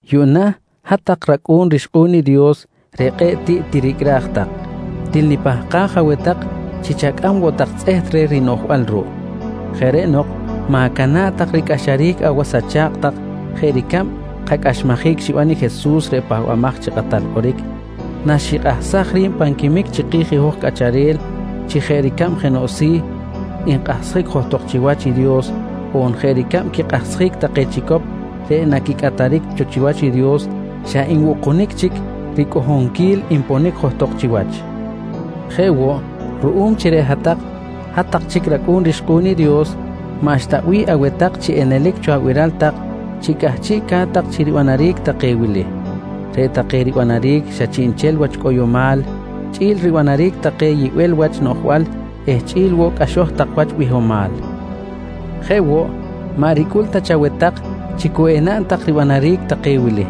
Yuꞌna hat-tak racꞌu̱n rixkꞌu̱n i Dios reꞌ kꞌe̱ꞌ tiꞌ tiricꞌraj tak, til nipahkaj aweh tak chi chacꞌam woꞌ tak tzꞌeht reh rinoꞌjbal ruꞌ. Jeꞌ reꞌ nok ma̱cana̱ꞌ tak ricꞌaxaric awas acha̱kꞌ tak jeꞌ ricab kacꞌaxmajic xiban i Jesus reꞌ Pahbamaj chi Kꞌatal Kꞌoric, naxikꞌahsaj ri̱b pan quimic chiki̱j i hoj cꞌacharel chi jeꞌ ricab jenoꞌ si̱ nkꞌahsjic johtok chiwach i Dios on jeꞌ ricab quikꞌahsjic take chicop reꞌ naquicꞌataric cho chiwach i Dios, xa nbukunic chic ricꞌohonquil nponic johtok chiwach. Jeꞌ woꞌ, ruꞌum chi reꞌ hat-tak, hat-tak chic racꞌu̱n rixkꞌu̱n i Dios, maꞌxta bih aweh tak chi enelic cho abiral tak chi cꞌahchiꞌca̱t tak chi ribanaric take wili: Reꞌ take ribanaric xa chiꞌnchel wach cꞌoyomal chꞌi̱l ribanaric take yibel wach noꞌjbal eh chꞌi̱l woꞌ cꞌaxo̱j tak wach bihomal. Jeꞌ woꞌ, maꞌ ricꞌul ta chaweh tak chi cu enaꞌn tak ribanaric take wili: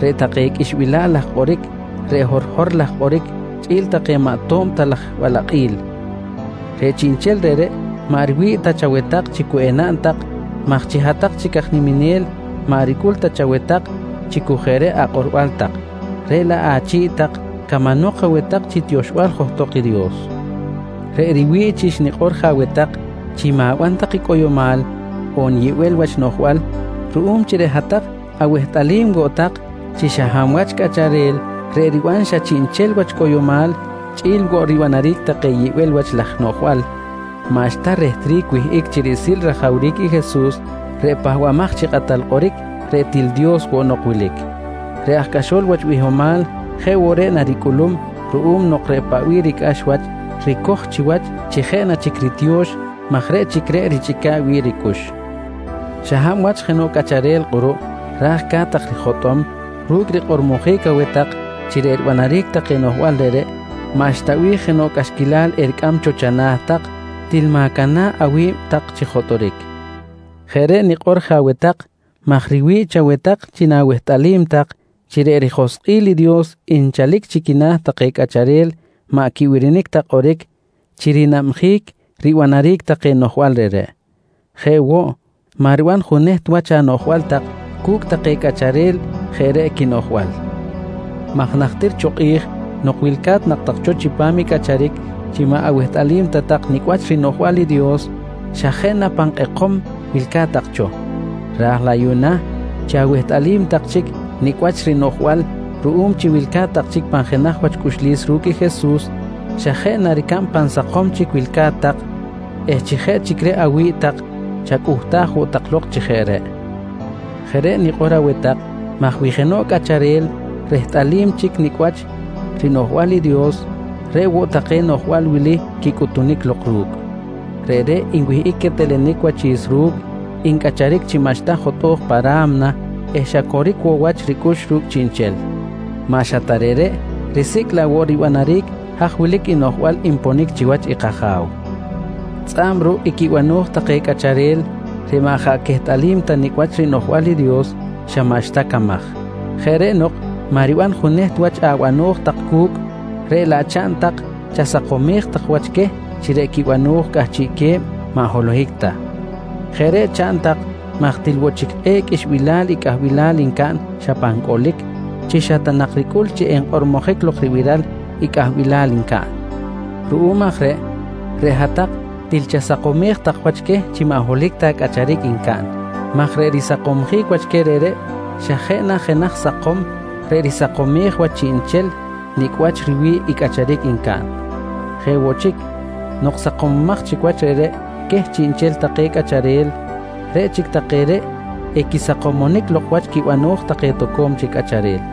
Reꞌ take qꞌuixbilal laj kꞌoric, reꞌ horhor laj kꞌoric chꞌi̱l take maꞌ to̱b ta laj balakꞌil. Reꞌ chiꞌnchel reꞌreꞌ maꞌ riwi̱ꞌ ta chaweh tak chi cu enaꞌn tak maj chi hat-tak chic aj niminel, maꞌ ricꞌul ta chaweh tak chi cu jeꞌ reꞌ akꞌorbal tak, reꞌ laꞌ achi̱ꞌ tak camanok aweh tak chi tioxbal johtok i Dios. Reꞌ riwi̱ꞌ chi xnikꞌor je aweh tak chi ma̱ban tak i cꞌoyomal, on yibel wach noꞌjbal ruꞌum chi reꞌ hat-tak awehtꞌalim woꞌ tak chi xa hab wach cꞌacharel reꞌ riban xa chiꞌnchel wach cꞌoyomal chꞌi̱l woꞌ ribanaric take yibel wach laj noꞌjbal, maꞌxta rehtric wihꞌic chi riꞌsil rajawric i Jesus reꞌ Pahbamaj chi Kꞌatal Kꞌoric, reꞌ til Dios woꞌ nok wilic. Reꞌ aj cꞌaxol wach bihomal jeꞌ woꞌ reꞌ naricꞌulum ruꞌum nok reꞌ paꞌ bih ricꞌax wach, ricoj chiwach chi jeꞌ na chic ritiyo̱x maj reꞌ chic reꞌ richꞌica̱ꞌ wi̱ꞌ ricꞌux. Xa hab wach jenoꞌ cꞌacharel kꞌuruꞌ ra̱j ca̱t-tak rijotꞌom ru̱cꞌ rikꞌormojic aweh tak chi reꞌ ribanaric take noꞌjbal reꞌreꞌ maꞌxta bih jenoꞌ cꞌaxquilal ericꞌam cho chana̱ tak, til ma̱cana̱ꞌ awi̱b tak chi jotꞌoric. Jeꞌ reꞌ nikꞌor je aweh tak maj riwi̱ꞌ chaweh tak chi na̱wehtꞌalim tak chi reꞌ rijoskꞌil i Dios nchalic chi quina̱ take cꞌacharel maꞌ quibirinic ta kꞌoric chi rinabjic ribanaric take noꞌjbal reꞌreꞌ. Jeꞌ woꞌ, maꞌ riban juneht wach anoꞌjbal tak cu̱cꞌ take cꞌacharel jeꞌ reꞌ quinoꞌjbal maj najtir cho kꞌi̱j nok wilca̱t nak tak cho chipam i cꞌacharic chi maꞌ awehtꞌalim ta tak nicꞌ wach rinoꞌjbal i Dios, xa jeꞌ na pan kꞌekom wilca̱t tak cho, ra̱j laꞌ yuꞌna chi awehtꞌalim tak chic nicꞌ wach rinoꞌjbal ruꞌum chi wilca̱t tak chic pan jenaj wach cꞌuxlis ru̱cꞌ i Jesus, xa jeꞌ na ricab pan sakom chic wilca̱t tak eh chi jeꞌ chic reꞌ awi̱ꞌ tak chacꞌuhtaj woꞌ tak lok chi jeꞌ reꞌ. Jeꞌ reꞌ nikꞌor aweh tak maj wi jenoꞌ cꞌacharel rehtꞌalim chic nicꞌ wach rinoꞌjbal i Dios, reꞌ woꞌ take noꞌjbal wili quicꞌutunic lok ru̱cꞌ: Reꞌreꞌ nwihꞌic quetelenic wachi̱s ru̱cꞌ, ncꞌacharic chi maꞌxta jotꞌo̱j pa ra̱mna eh xa coric woꞌ wach ricꞌux ru̱cꞌ chiꞌnchel. Maꞌ xa ta reꞌreꞌ, risicꞌ laꞌ woꞌ ribanaric haj wilic noꞌjbal nponic chiwach i kAja̱w. Tzꞌa̱b ruꞌ i quibano̱j take cꞌacharel reꞌ maꞌ jaꞌ quehtꞌalim ta nicꞌ wach rinoꞌjbal i Dios, xa maꞌxta camaj. Jeꞌ reꞌ nok maꞌ riban juneht wach abano̱j tak cu̱cꞌ, reꞌ laꞌ chaꞌn tak chasakomej tak wach queh chi reꞌ quibano̱j cꞌahchiꞌ que̱b maꞌ holohic ta. Jeꞌ reꞌ chaꞌn tak maj til woꞌ chic kꞌe̱ꞌ qꞌuixbilal i cꞌahbilal ncaꞌn xa pan cꞌolic chi xa ta nak ricꞌul chi enkꞌormojic lok ribiral i cꞌahbilal ncaꞌn. Ruꞌum aj reꞌ, reꞌ hat-tak til chasakomej tak wach queh chi maꞌ holohic ta cꞌacharic ncaꞌn maj reꞌ risakomsjic wach queh reꞌreꞌ, xa jeꞌ na jenaj sakom reꞌ risakomej wach chiꞌnchel nicꞌ wach riwi̱ꞌ i cꞌacharic ncaꞌn. Jeꞌ woꞌ chic, nok sakomomaj chic wach reꞌreꞌ queh chiꞌnchel take cꞌacharel, reꞌ chic take reꞌ equisakomonic lok wach quibano̱j take toco̱m chic cꞌacharel.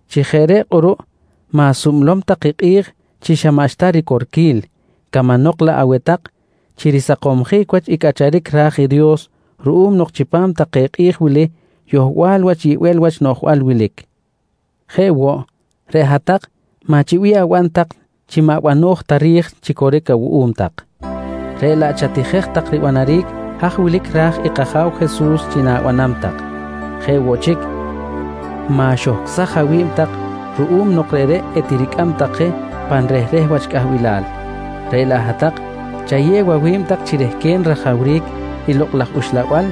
Chi jeꞌ reꞌ kꞌuruꞌ ma̱sublom tak i kꞌi̱j chi xa maꞌxta ricorquil, camanok laꞌ aweh tak chi risakomsjic wach i cꞌacharic ra̱j i Dios ruꞌum nok chipam take kꞌi̱j wili yohbal wach yibel wach noꞌjbal wilic. Jeꞌ woꞌ, reꞌ hat-tak maꞌ chi bih aban tak chi maꞌ bano̱j ta ri̱j chi coric awuꞌum tak, reꞌ laꞌ chatijej tak ribanaric haj wilic ra̱j i kAja̱w Jesus chi na̱banam tak. Jeꞌ woꞌ chic, ma̱xohcꞌsaj awi̱b tak ruꞌum nok reꞌreꞌ etiricꞌam tak je pan rehreh wach cꞌahbilal, reꞌ laꞌ hat-tak chayew awi̱b tak chirehquen rajawric i Lokꞌ laj Uxlabal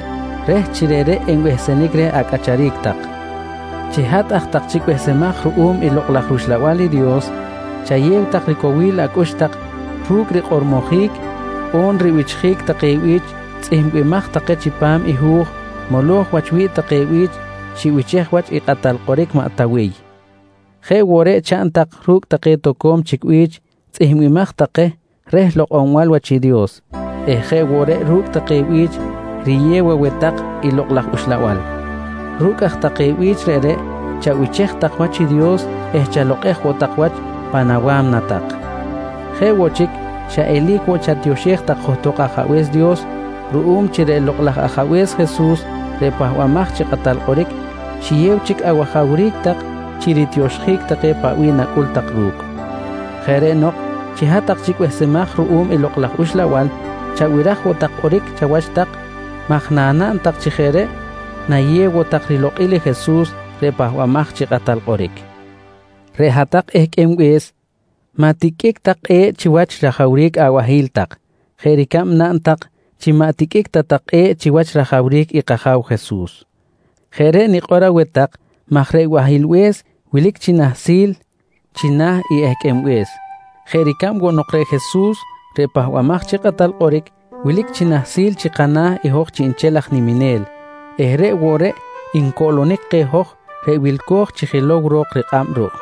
reh chi reꞌreꞌ enbehsenic reh acꞌacharic tak. Chi hat aj tak chic behsemaj ruꞌum i Lokꞌ laj rUxlabal i Dios, chayew tak ricowil acꞌux tak ru̱cꞌ rikꞌormojic on ribichjic take bi̱ch tzꞌihmbimaj take chipam i hu̱j moloj wach wi̱ꞌ take bi̱ch xibichej wach i kꞌatal kꞌoric maꞌ Tawiy. Jeꞌ woꞌ reꞌ chaꞌn tak ru̱cꞌ take toco̱m chic bi̱ch tzꞌihmbimaj take reh lokꞌonbal wach i Dios eh jeꞌ woꞌ reꞌ ru̱cꞌ take bi̱ch riyew aweh tak i Lokꞌ laj Uxlabal. Ru̱cꞌ aj take bi̱ch reꞌreꞌ chabichej tak wach i Dios eh chalokꞌej woꞌ tak wach pan awa̱mna tak. Jeꞌ woꞌ chic xa eli̱c woꞌ chatioxej tak johtok Ajabe̱s Dios ruꞌum chi reꞌ Lokꞌ laj Ajabe̱s Jesus reꞌ Pahbamaj chi Kꞌatal Kꞌoric, xiyew chic awajawric tak chi ritioxjic take paꞌ bih nacꞌul tak ru̱cꞌ. Jeꞌ reꞌ nok chi hat-tak chic behsemaj ruꞌum i Lokꞌ laj Uxlabal, chabiraj woꞌ tak kꞌoric chawach tak maj nanaꞌn tak chi jeꞌ reꞌ nayew woꞌ tak rilokꞌil i Jesus reꞌ Pahbamaj chi Kꞌatal Kꞌoric. Reꞌ hat-tak ehqꞌuenbe̱s maꞌ tiqꞌuic tak kꞌe̱ꞌ chiwach rajawric abahi̱l tak jeꞌ ricab naꞌn tak chi maꞌ tiqꞌuic ta tak kꞌe̱ꞌ chiwach rajawric i kAja̱w Jesus. Jeꞌ reꞌ nikꞌor aweh tak maj reꞌ bahilbe̱s wilic chi nahsil china̱ i ehqꞌuenbe̱s jeꞌ ricab woꞌ nok reꞌ Jesus reꞌ Pahbamaj chi Kꞌatal Kꞌoric, wilic chi nahsil chi kana̱ i hoj chiꞌnchel aj niminel eh reꞌ woꞌ reꞌ ncoꞌlonic keh hoj reꞌ wilco̱j chi jilow ro̱k rikꞌab ruꞌ.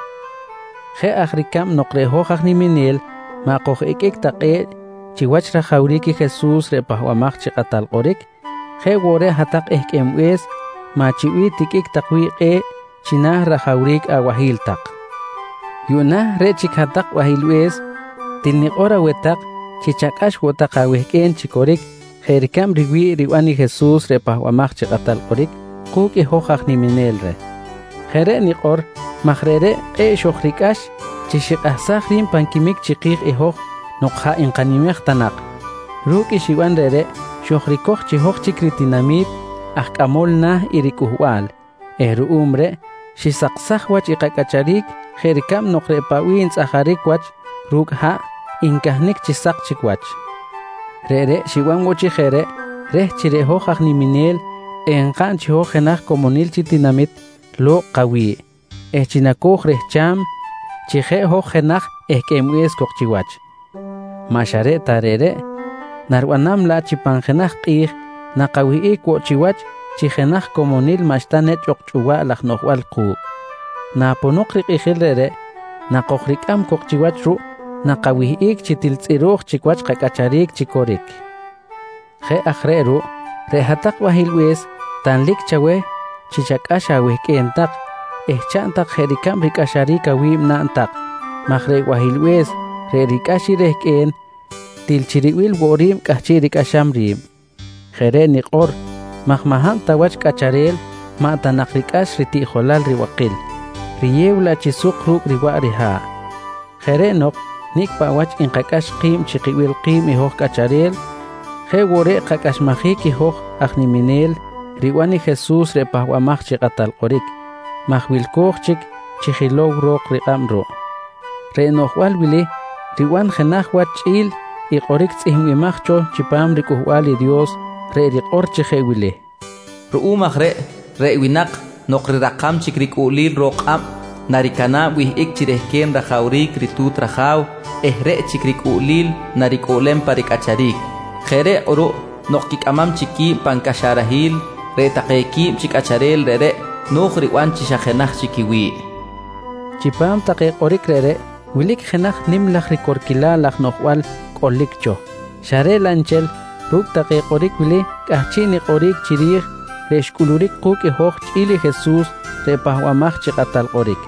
Jeꞌ aj ricab nok reꞌ hoj aj niminel maꞌ koj-iqꞌuic ta kꞌe̱ꞌ chiwach rajawric i Jesus reꞌ Pahbamaj chi Kꞌatal Kꞌoric, jeꞌ woꞌ reꞌ hat-tak ehqꞌuenbe̱s maꞌ chi bih tiqꞌuic tak wi̱ꞌ kꞌe̱ꞌ china̱ rajawric abahi̱l tak. Yuꞌna reꞌ chic hat-tak bahilbe̱s, til nikꞌor aweh tak chi chacꞌax woꞌ tak awehqꞌue̱n chi coric jeꞌ ricab riwi̱ꞌ riban i Jesus reꞌ Pahbamaj chi Kꞌatal Kꞌoric ku̱cꞌ i hoj aj niminel reh. Jeꞌ reꞌ nikꞌor maj reꞌreꞌ kꞌe̱ꞌ xojricꞌax chi xikꞌahsaj ri̱b pan quimic chiki̱j i hoj nok jaꞌ nkanimej ta nak. Ru̱cꞌ i xiban reꞌreꞌ xojricoj chi hoj chic ritinami̱t aj cꞌamol na̱ i ricꞌuhbal eh ruꞌum reꞌ xisaksaj wach kacꞌacharic jeꞌ ricab nok reꞌ paꞌ bih ntzꞌajaric wach ru̱cꞌ haꞌ ncahnic chi sak chic wach. Reꞌreꞌ xiban woꞌ chi jeꞌ reꞌ reh chi reꞌ hoj aj niminel enkaꞌn chi hoj jenaj comonil chi tinamit lo̱kꞌ kawi̱ꞌ eh chi naco̱j rehcham chi jeꞌ hoj jenaj ehqꞌuenbe̱s cok chiwach. Maꞌ xa reꞌ ta reꞌreꞌ, naribanam laꞌ chi pan jenaj kꞌi̱j nakawihꞌic woꞌ chiwach chi jenaj comonil maꞌxta nechꞌ ok chꞌuwaꞌ laj noꞌjbal ku̱cꞌ. Naponok rikꞌijil reꞌreꞌ nakojricꞌam cok chiwach ruꞌ, nakawihꞌic chi til tzꞌiro̱j chic wach kacꞌacharic chi coric. Jeꞌ aj reꞌ ruꞌ reꞌ hat-tak bahilbe̱s, tanlic chaweh chi chacꞌax awehqꞌue̱n tak eh chaꞌn tak jeꞌ ricab ricꞌaxaric awi̱b naꞌn tak maj reꞌ bahilbe̱s reꞌ ricꞌax i rehqꞌue̱n til chi ribil woꞌ ri̱b cꞌahchiꞌ ricꞌaxam ri̱b. Jeꞌ reꞌ nikꞌor maj maꞌ hab ta wach cꞌacharel maꞌ ta nak ricꞌax ritiꞌjolal ribakil, riyew laꞌ chi suk ru̱cꞌ riwaꞌ riha̱ꞌ. Jeꞌ reꞌ nok nicꞌ paꞌ wach nkacꞌax ki̱b chi kibil ki̱b i hoj cꞌacharel jeꞌ woꞌ reꞌ kacꞌaxmajic i hoj aj niminel riban i Jesus reꞌ Pahbamaj chi Kꞌatal Kꞌoric maj wilco̱j chic chi jilow ro̱k rikꞌab ruꞌ. Reꞌ noꞌjbal wili riban jenaj wach chꞌi̱l i kꞌoric tzꞌihmbimaj cho chipam riCꞌuhbal i Dios reꞌ rikꞌor chi jeꞌ wili: “Ruꞌum aj reꞌ, reꞌ winak nok rirakam chic ricꞌuꞌlil ro̱k kꞌab, naricana̱b wihꞌic chi rehquen rajawric ritu̱t raja̱w eh reꞌ chic ricꞌuꞌlil naricꞌuꞌlem pa ricꞌacharic. Jeꞌ reꞌ kꞌuruꞌ nok quicꞌamam chic qui̱b pan caxarahil, reꞌ take quib chi cꞌacharel reꞌreꞌ no̱j riban chi xa jenaj chic quiwi̱ꞌ, nqui tzꞌihmbimaj cho. Chipam take kꞌoric reꞌreꞌ wilic jenaj nim laj ricorquilal laj noꞌjbal cꞌolic cho, xa reꞌ laꞌ nchel, ru̱cꞌ take kꞌoric wili cꞌahchiꞌ nikꞌoric chiri̱j reꞌ xcꞌuluric ku̱cꞌ i hoj chꞌi̱l i Jesus reꞌ Pahbamaj chi Kꞌatal Kꞌoric,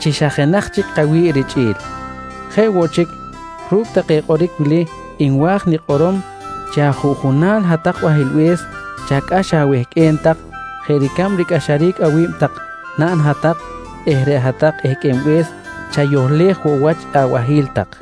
chi xa jenaj chic kawi̱ꞌ richꞌi̱l. Jeꞌ woꞌ chic, ru̱cꞌ take kꞌoric wili nwa̱j nikꞌorom chi ajuꞌjunal hat-tak bahilbe̱s chacꞌax awehqꞌue̱n tak jeꞌ ricab ricꞌaxaric awi̱b tak naꞌn hat-tak eh reꞌ hat-tak ehqꞌuenbe̱s chayohlej woꞌ wach i abahi̱l tak.